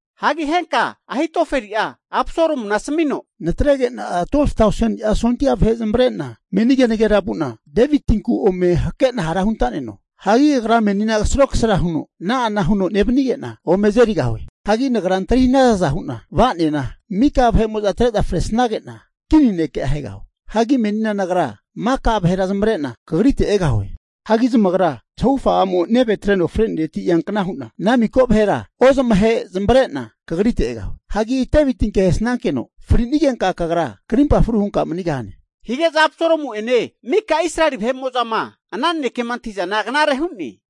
Hagi henka Ahitofeli'a Absalomuna asamino, natrege'na 12tauseni'a sondia vahe zamavare'na meni kenagera vu'na Devitinku ome hakena hara huntaneno. Hagi agra menina kasaro kasara huno ana'ana huno nevanige'na ome azerigahue. Hagi nagra antri hanazaza hu'na va'nena, mika vahe'mo'za atre'za fresage'na kini ne'ke ahegahue. Hagi menina nagra maka vahera zamavarena kagrite egahue. Hagi zamagra zahufa a'mo neve atreno frenereti ete eankna hu'na, ana miko vahera ozamahe zamavare'na kagrite egahue. Hagi Devitinke ahesankeno frinigenka kagra krimpa fru hunka manigahane. Hige'za Absalomu'ene mika Israeli kva vahe'mo'zama ana nanekema antahi'zana knare hu'ne.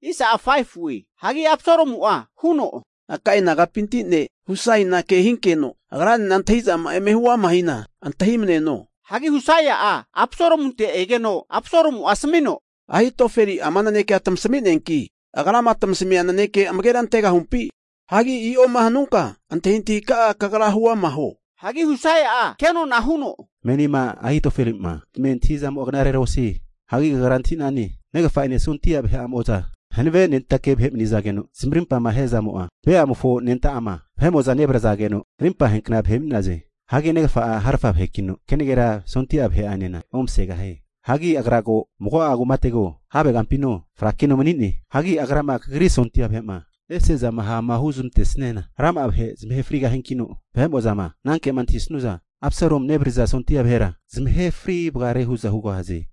Hagi Absalomu'a huno, Akai nagapinti ne' Husaina kehinkeno agranena antahi'zama'a eme huama hina antahimaneno. Hagi Husai'a Absalomunte egeno Absalomu'a asamino, Ahitofeli'a ama naneke tasami'neanki agrama tasamia naneke amagera antegahumpi? Hagi i'oma hanunka antahintahi ka'a kagra hu ama huo. Hagi Husai'a kenona huno, Menima Ahitofeli'ma tamia antahi'zamo'a knarera osie. Hagi kagra antahi'nane, negafa'ene sondia vahe'amo'za hanavenentake vahe mani'nazageno zamarimpama ahe'zamo'a Beamofo anenta'ama vahe'mo'za nevrazageno arimpa aheankna vahe mani'naze. Hagi negafa'a harafa vahekino, kenagera sondia vahe'anena omasegahie. Hagi agra ko mago'a kumatego, have kampino frakino mani'ne. Hagi agrama kagri sondia vahe'ma ese'zana ha'ma huzmantesniana rama'a vahe zamahe frigahiankino, vahe'mo'zama anankema antahisnu'za Absalomu nevaririza sondia vahera zamahe fri vagaraze hu'za hugahaze.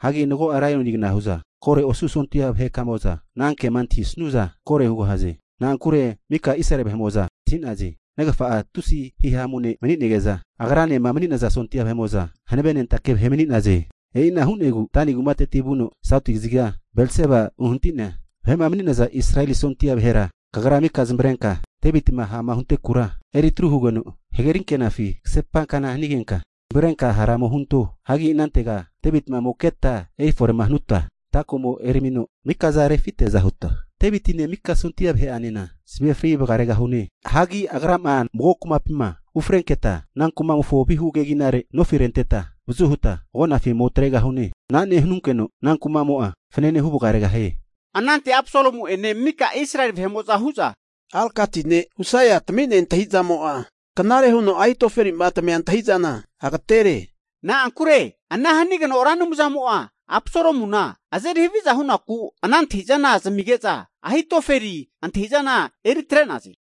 Hagi mago'a laionigana hu'za koro osu sondia vahe'kamo'za anankema antahisnu'za koro hugahaze. Na'ankure mika Israeli vahe'mo'za antahi'naze, negafa'a tusi hihamu ne' mani'nege'za, agranema mani'naza sondia vahe'mo'za hanavenentake vahe mani'naze. E'ina hu'negu noti kaziga Dani kumateti vuno sauti kaziga Bersebama uhanati'nea vahe'ma mani'naza Israeli sondia vahera, kagra mika zamavarenka Devitima ha'ma huntenakura eritru hugeno hagerinkenafi kasepakna hanigenka, zamavarenka hara ome hunto. Hagi inantego Devitima ome keta erifore'ma hanuta, ata komo eramino mikaza refiteaza huta, Devitine mika sondia vahe'anena zamahe fri vaga regahune. Hagi agrama mago kumapima ufrenketa ana kumofo vihu keginare nofi renteta avazu huta agupofi ome atregahune. Ana nehanunkeno ana kuma'mo fanane huvagaregahie. Anante Absalomu'ene mika Israeli vahe'mo'za hu'za, Arkiti ne' Husaia tamia antahizamo'a knare huno Ahitofelima tamia antahi'zana agatere. Na'ankure ana hanigeno Ra Anumzamo'a Absalomuna azeri haviza hunaku ana antahi'zana zamige'za Ahitofeli antahi'zana eri atre'naze.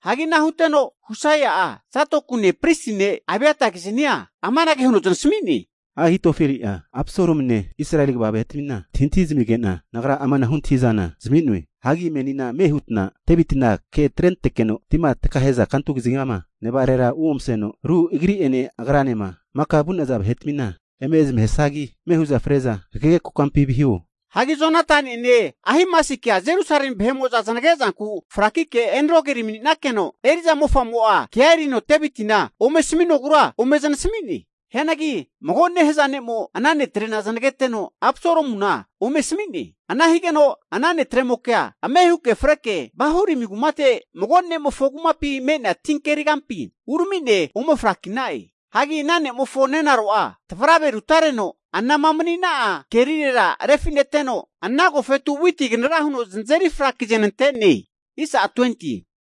Hagi ana huteno Husai'a Zadokune pristi ne' Abiatakizania amanage huno zamasami'ne, Ahitofeli'a Absalomune Israeli kva vahe'tamina antahintahi zamige'na nagra amanahu antahi'za zami'noe. Hagi menina ame hutna Devitina ke atrentekeno, tima takahe'za kantu kazigama nevarera uomaseno, ru agri'ene agranema maka vu'naza vahetamina eme zamahesagi ame hu'za freza hagege kokampi viho. Hagi Jonatani'ene Ahimasikea Jerusalemi vahe'mo'za zanage'zanku frakike Enrogeli mani'nakeno eri'za mofamo kea erino Devitima ome asaminogura ome zanasami'ne. Hianagi mago nehaza ne'mo ana netrena zanageteno Absalomuna ome asami'ne. Ana higeno ana netremokea ame huke freke Bahurimi kumate mago ne'mofo kumapi me'nea ti kerigampi uramine ome fraki'na'e. Hagi ana ne'mofo nenaro'a tavrave rutareno anama mani'na'a kerirera refi'neteno ana agofetu witi kanara huno zanazeri frakizanante'ne.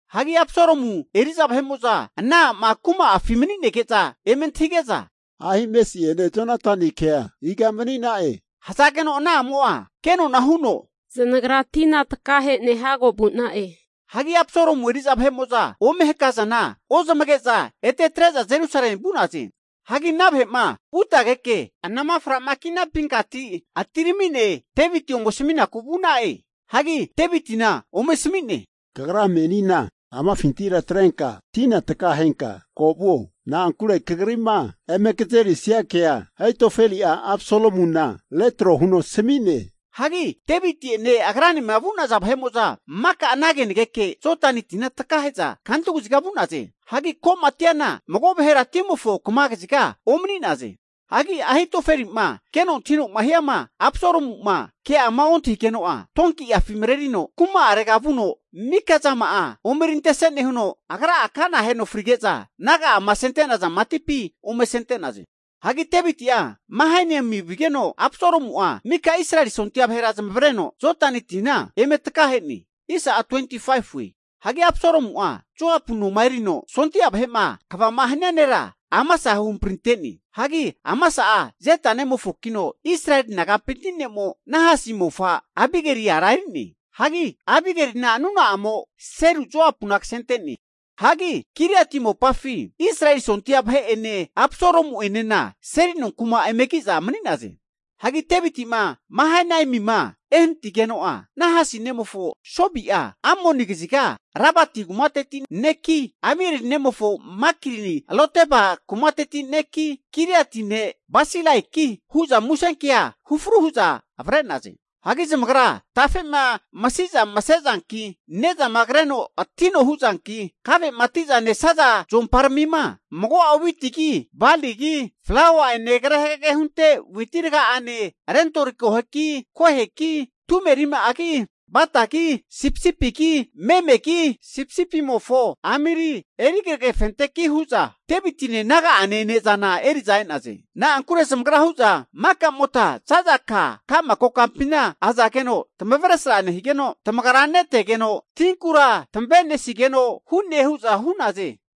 Hagi Absalomu eri'za vahe'mo'za ana a'ma kuma'afi mani'nege'za eme antahige'za, Ahimasi'ene Jonatanikea iga mani'na'e? Hazageno ana a'mo'a kenona huno, zanagra tina takahene hago vu'na'e. Hagi Absalomu eri'za vahe'mo'za ome hakazana ozamage'za ete atre'za Jerusalemi vu'naze. Hagi ana vahe'ma vutageke anama framaki'napinkati atiramine Deviti ome asaminaku vu'na'e. Hagi Devitina ome asamine, kagra menina amafintira atrenka tina takahenka ko vuo. Na'ankure kagri'ma eme kazerisania kea Ahitofeli'a Absalomuna retro huno asami'ne. Hagi Deviti'ene agranema vu'naza vahe'mo'za maka ana kenageke Jodani tina takahe'za kantu kaziga vu'naze. Hagi ko'ma atiana mago vahera timofo kama kaziga omani'naze. Hagi Ahitofeli'ma keno antahino'ma hiama Absalomu'ma ke'ama ontahigeno'a, donkiafi marerino kuma arega vuno, mika'zama omerintese nehuno, agra kana aheno frige'za naga'ama asenentaza matipi ome asente'naze. Hagi Deviti'a Mahanaimi vigeno, Absalomu'a mika Israeli sondia vahera zamavareno Jodani tina eme takahe'ne. Hagi Absalomu'a Joapu noma erino sondia vahe'ma kvama hania nera Amasa huhamprinte'ne. Hagi Amasa'a Jeta nemofokino Israeli nagapinti ne'mo Nahasi mofa Abigeli ara eri'ne. Hagi Abigelina nuna'amo Seru Joapu'na kasente'ne. Hagi Giliati mopafi Israeli sondia vahe'ene Absalomu'enena seli nonku'ma eme ki'za mani'naze. Hagi Deviti'ma Mahanaimima ehanatigeno'a, Nahasi nemofo Sobi'a Amoni kaziga Rabati kumateti ne'ki, Amieli nemofo Makiri Lodeba kumateti ne'ki, Giliati ne' Barsilaiki hu'za musenkea hufru hu'za avre'naze. Hagi zamagra tafe'ma masiza mase zanki, ne'zama kreno atino huzanki, kave'ma ati'za nesaza zuomparamima, mago'a witigi baligi flaua'ene kre hagege hunte witi aragane, rentori koheki, koheki, tume rima'agi, batagi, sipisipigi memegi sipisipimofo amiri eri kragefinteki hu'za Devitine naga'ane ne'zana eri'za e'naze. Na'ankure zamagra hu'za maka'mota za'za ka ka'ma kokampina azageno tamavesra nehigeno, tamagara netegeno, tinkura tamavenisigeno hu'ne hu'za hu'naze.